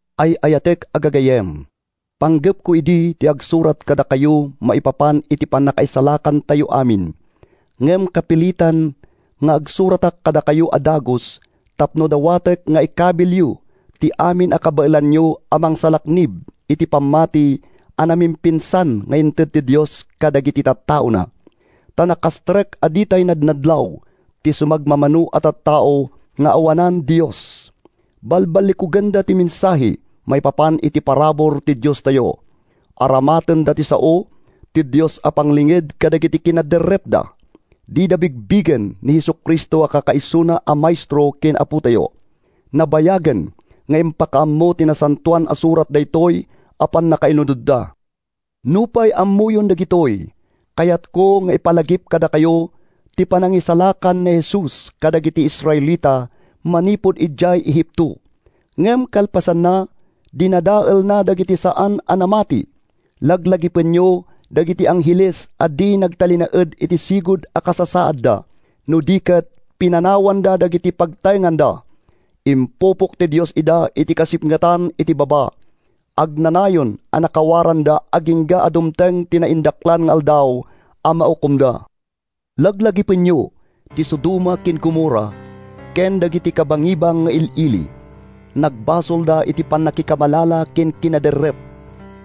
Ay-ayatek a gagayyem, panggepko idi ti agsurat kadakayo maipapan iti pannakaisalakantayo amin. Ngem kapilitan nga agsuratak kadakayo a dagus tapno dawatek nga ikabilyo ti amin a kabaelanyo a mangsalaknib iti pammati a namimpinsan nga inted ti Dios kadagiti tattaona. Ta nakastrek a ditay nadnadlaw ti sumagmamano a tattao nga awanan Dios. Balballikugenda ti mensahe maipapan iti parabur ti Diostayo. Aramatenda ti sao ti Dios a panglinged kadagiti kinaderrepda. Dida bigbigen ni Jesu-Cristo a kakaisuna a Maestro ken Apotayo. Nabayagen nga impakaammo ti Nasantoan a Surat daytoy a pannakailunodda. Nupay ammoyon dagitoy, kayatko nga ipalagip kadakayo ti panangisalakan ni Jesus kadagiti Israelita manipud idiay Egipto, ngem kalpasanna, dinadaelna dagiti saan a namati. Laglagipenyo dagiti angheles a di nagtalinaed iti sigud a kasasaadda, no di ket pinanawanda dagiti pagtaenganda. Impupok ti Dios ida iti kasipngetan iti baba. Agnanayon a nakawaranda agingga a dumteng ti naindaklan nga Aldaw a maukomda. Laglagipenyo ti Sodoma ken Gomorra ken dagiti kabangibang nga il-ili. Nagbasolda iti pannakikamalala ken kinaderrep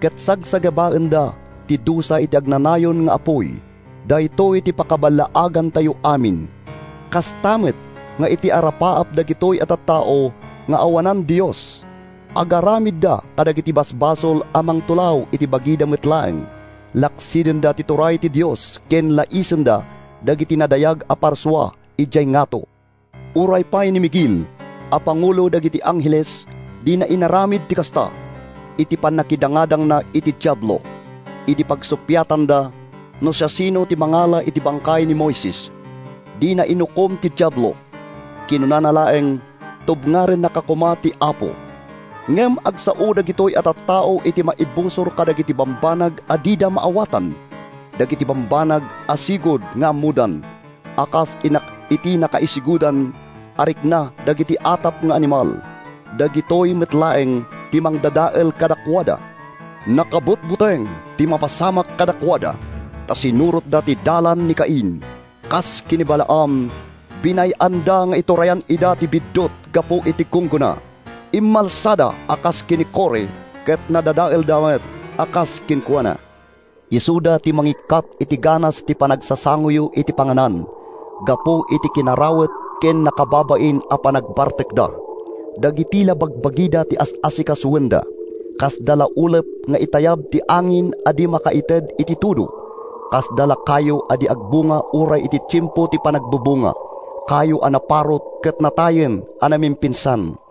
ket sagsagabaenda ti dusa iti agnanayon nga apuy. Daytoy ti pakaballaagantayo amin. Kasta met nga iti arapaap dagitoy a tattao nga awanan Dios, agaramidda kadagiti basbasol a mangtulaw iti bagida met laeng. Laksidenda ti turay ti Dios ken laisenda dagiti nadayag a parsua idiay ngato. Uray pay ni Miguel a pangulo dagiti angheles dina inaramid ti kasta. Iti pannakidangadangna iti Diablo, idi pagsuppiatanda no siasino ti mangala iti bangkay ni Moises, dina inukom ti Diablo. Kinunana laeng, “Tubngarennaka koma ti Apo!” Ngem agsao dagitoy a tattao iti maibusor kadagiti bambanag a dida maawatan. Dagiti bambanag a sigud nga ammodan, a kas iti nakaisigudan a rikna dagiti atap nga animal, dagitoy met laeng ti mangdadael kadakuada. Nakabutbuteng ti mapasamak kadakuada ta sinurotda ti dalan ni Cain. Kas ken ni Balaam, binay-anda nga iturayan ida ti biddut gapu iti gunggona. Immalsada a kas ken ni Core ket nadadaelda met a kas kenkuana. Isuda ti mangikkat iti ganas ti panagsasangoyo iti panganan gapu iti kinarawet ken nakababain a panagbartekda. Dagiti la bagbagida ti as-asikasoenda. Kasda la ulep nga itayab ti angin a di makaited iti tudo. Kasda la kayo a di agbunga uray iti tiempo ti panagbubunga, kayo a naparut ket natayen a namimpinsan.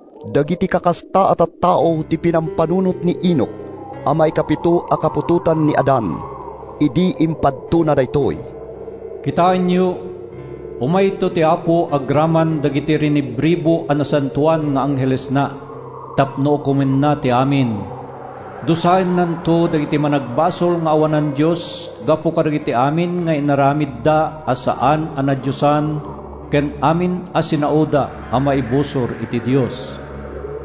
Dagiti kakasta a tattao ti pinampanunot ni Enoc a maikapito a kaputotan ni Adan, idi impadtona daytoy: “Kitaenyo! Umayto ti Apo agraman dagiti rinibribu a nasantoan nga anghelesna tapno ukomenna ti amin. Dusaennanto dagiti managbasol nga awanan Dios gapu kadagiti amin nga inaramidda a saan a nadiosan ken amin a sinaoda a maibusor iti Dios!”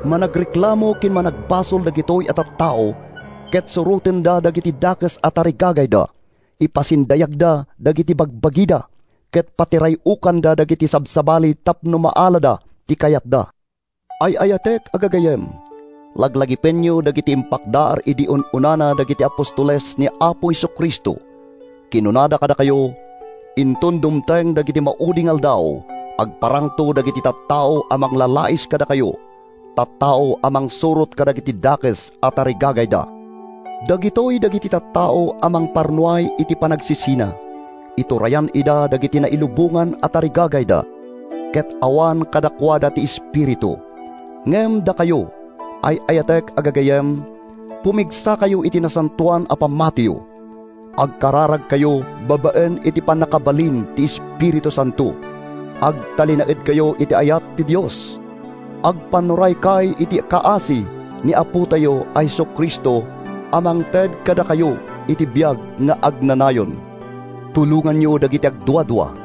Managreklamo ken managpabasol dagitoy a tattao ket surotenda dagiti dakes a tarigagayda. Ipasindayagda dagiti bagbagida, ket patiray-okanda dagiti sabsabali tapno maalada ti kayatda. Ay-ayatek a gagayyem, laglagipenyo dagiti impakdaar idi un-unana dagiti apostoles ni Apo Jesu-Cristo. Kinunada kadakayo, “Inton dumteng dagiti maudi nga aldaw, agparangto dagiti tattao a manglalais kadakayo, tattao a mangsurot kadagiti dakes a tarigagayda.” Dagitoy dagiti tattao a mangparnuay iti panagsisina. Iturayan ida dagiti nailubongan a tarigagayda, ket awan kadakuada ti Espiritu. Ngem dakayo, ay-ayatek a gagayyem, pumigsakayo iti nasantoan a pammatiyo. Agkararagkayo babaen iti pannakabalin ti Espiritu Santo. Agtalinaedkayo iti ayat ti Dios. Agpannuraykay iti kaasi ni Apotayo a Jesu-Cristo a mangted kadakayo iti biag nga agnanayon. Tulonganyo dagiti agduadua.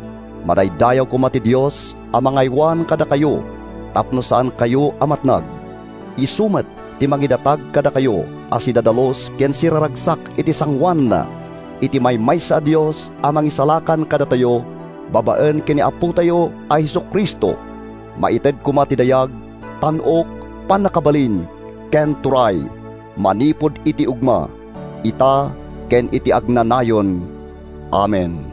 Madaydayaw koma ti Dios a mangaywan kadakayo tapno saankayo a matnag. Isu met ti mangidatag kadakayo a sidadalus ken siraragsak iti sangoananna. Iti maymaysa a Dios a Mangisalakan kadatayo babaen ken ni Apotayo a Jesu-Cristo, maited koma ti dayag, tan-ok, pannakabalin ken turay, manipud idi ugma, ita, ken iti agnanayon! Amen.